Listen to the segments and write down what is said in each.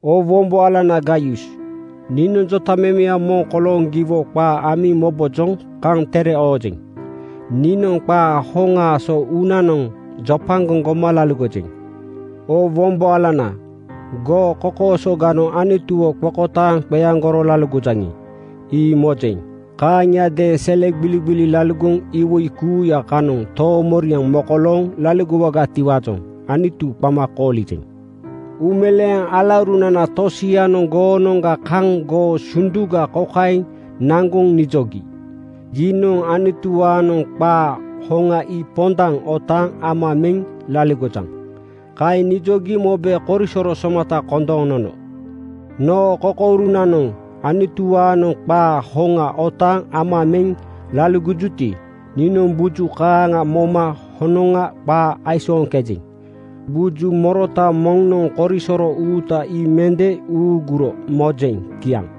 Oo wombo alana Gaius, niinoŋ jotamemeya moŋ kolooŋ giwo qaa amiŋ mobojoŋ kaŋ tere oojeŋ. Niinoŋ qaa hoŋaa so uunanoŋ jopagoŋ goma laligojeŋ. Oo wombo alana, goo kokoosoganoŋ Anutuwo qokotaaŋ qeaŋgoro laligojaŋi, ii mojeŋ. Kaaŋiadeeŋ sele gbiligbili laligoŋ iwoi kuuya kanoŋ toomoriaŋ mokolooŋ laligowaatiwaajoŋ Anutu qama koolijeŋ. Uumeleeŋ alaurunana tosianoŋ goonoŋga kaŋ goo sunduga kokaeŋ naŋgoŋ nijogi, “Giinoŋ Anutuwaanoŋ qaa hoŋa ii pondaŋ otaaŋ ama meŋ laligojaŋ.” Kaeŋ nijogi mobe korisoro somata kondooŋ nono. Noo kokourunanoŋ Anutuwaanoŋ qaa hoŋa otaaŋ ama meŋ laligojuti, niinoŋ buju kaaŋa moma honoŋa qaa aisooŋkejeŋ. Buju morota moŋnoŋ korisoro uuta ii mende uuguro mojeŋ. Kiaŋ.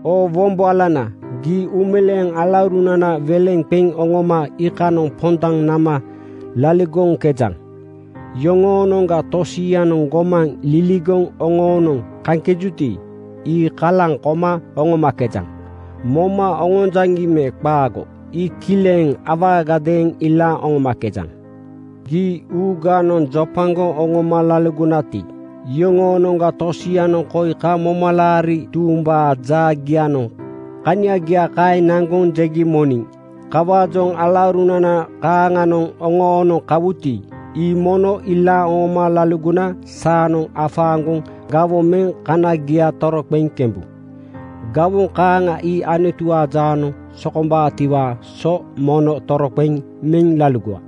Oo wombo alana, gii uumeleeŋ alaurunana weleŋ qeŋ oŋoma iikanoŋ pondaŋ nama laligoŋkejaŋ. Yoŋoonoŋga tosianoŋ gomaŋ liligoŋ oŋoonoŋ kaŋkejuti, ii kalaŋ koma oŋomakejaŋ. Moma oŋonjaŋi me qaago, ii kileŋ awaagadeeŋ ilaaŋ oŋomakejaŋ. Gii uuganoŋ jopagoŋ oŋoma laligonati, iyoŋoonoŋga tosianoŋ koi kaŋ momalaari tuumbaa jaagianoŋ kaniaga kaeŋ naŋgoŋ jegi moniŋ. Kawaajoŋ alaurunana kaaŋanoŋ oŋoonoŋ kawuti, ii mono ilaaŋ oŋoma laligona saanoŋ afaaŋgoŋ gawoŋ meŋ kanagia toroqeŋ kembu. Gawoŋ kaaŋa ii Anutuwaa jaanoŋ sokombaatiwaa so mono toroqeŋ meŋ laligowa.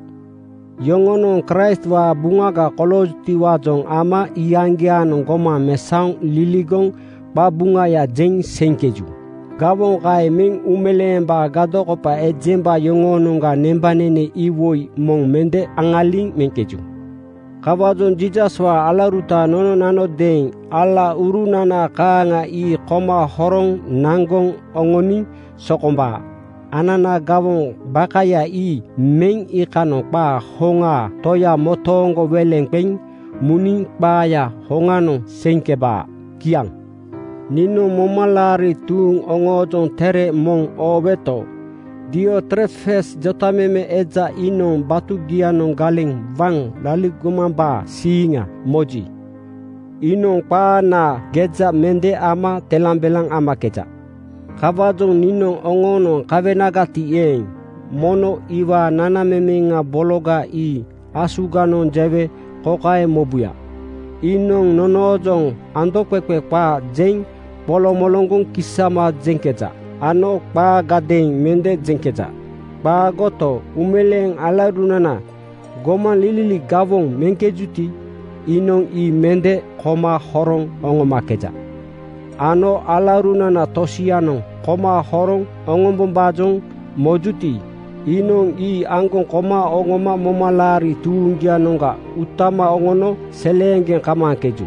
Yoŋonoŋ Kraistwaa buŋaga koloojutiwaajoŋ ama iyaŋgiaanoŋ gomaŋ mesaoŋ liligoŋ qabuŋaya jeŋ seiŋkeju. Gawoŋ kaeŋ meŋ uumeleembaa gadokopa ejemba yoŋoonoŋga nembanene iwoi moŋ mende aŋaliŋ meŋkeju. Kawaajoŋ Jiisaswaa alauruta nononanodeeŋ alaurunana kaaŋa ii koma horoŋ naŋgoŋ oŋoniŋ sokombaa. Anana gawoŋ bakaya ii meŋ iikanoŋ qaa hoŋaa Toya motooŋ weleŋ qeŋ muniŋ qaaya hoŋanoŋ seiŋkebaa. Kiaŋ. Niinoŋ momalaari tuuŋ oŋoojoŋ tere moŋ ooweto, Diotrefes jotameme eja iinoŋ batugianoŋ galeŋ waŋ laligomambaa siiŋa moji, iinoŋ qaanaa geja mende ama telambelaŋ amakeja. Kawaajoŋ niinoŋ oŋoonoŋ kawenagati eeŋ, mono iwaa nanamemeŋa bologa ii asuganoŋ jewe kokaeŋ mobuya: Iinoŋ nonoojoŋ andoqeqe qaa jeŋ qoloŋgoŋ kisama jeŋkeja ano qaagadeeŋ mende jeŋkeja. Qaagoto, uumeleeŋ alaurunana gomaŋlili gawoŋ meŋkejuti, iinoŋ ii mende koma horoŋ oŋomakeja ano alaurunana tosianoŋ koma horoŋ oŋombombaajoŋ mojuti, iinoŋ ii aŋgoŋ koma oŋoma momalaari tuuŋgianoŋga utama oŋono seleeŋgeŋ kamaaŋkeju.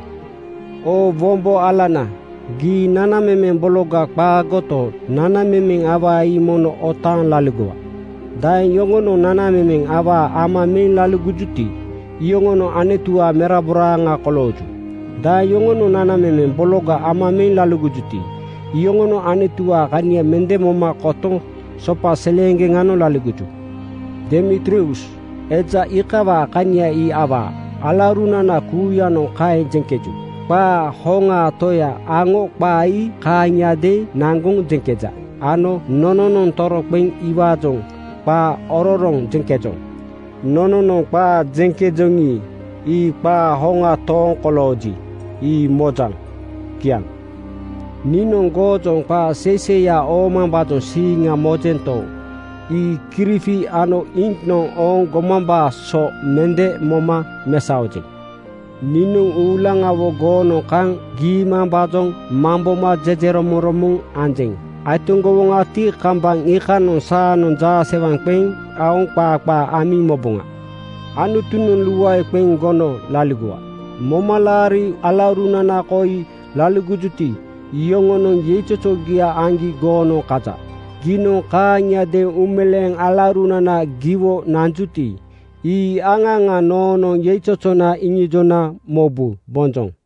Oo wombo alana, gii nanamemeŋ bologa qaagoto, nanamemeŋ awaa ii mono otaaŋ laligowa. Daeŋ yoŋonoŋ nanamemeŋ awaa ama meŋ laligojuti, iyoŋonoŋ Anutuwaa meraboraaŋa kolooju. Daeŋ yoŋonoŋ nanamemeŋ bologa ama meŋ laligojuti, iyoŋonoŋ Anutuwaa kania mende moma kotoŋ sopa seleeŋgeŋanoŋ laligoju. Demitrius eja iikawaa kania ii awaa. Alaurunana kuuyanoŋ kaeŋ jeŋkeju. Qaa hoŋaa Toya aŋo qaa ii kaaŋiadeeŋ naŋgoŋ jeŋkeja ano nononoŋ toroqeŋ iwaajoŋ qaa ororoŋ jeŋkejoŋ. Nononoŋ qaa jeŋkejoŋi, ii qaa hoŋa tooŋ kolooji, ii mojaŋ. Kiaŋ. Niinoŋ goojoŋ qaa seiseiya oomambaajoŋ siiŋa mojento, ii kirifi ano iŋknoŋ ooŋ gomambaa so mende moma mesaojeŋ. Niinoŋ uulaŋawo goonoŋ kaŋ giimambaajoŋ mamboma jejeromoŋromoŋ anjeŋ. Aitoŋgowoŋati, kambaŋ iikanoŋ saanoŋ jaasewaŋ qeŋ aoŋ qaa qaa amiŋ moboŋa. Anutunoŋ luae qeŋ gono laligowa! Momalaari alaurunana koi laligojuti, iyoŋonoŋ yeizozogia aŋgi goonoŋ kaja. Giinoŋ kaaŋiadeeŋ uumeleeŋ alaurunana giwo nanjuti, ii aŋa aŋa noonoŋ yeizozona iŋijona mobu. Bonjoŋ!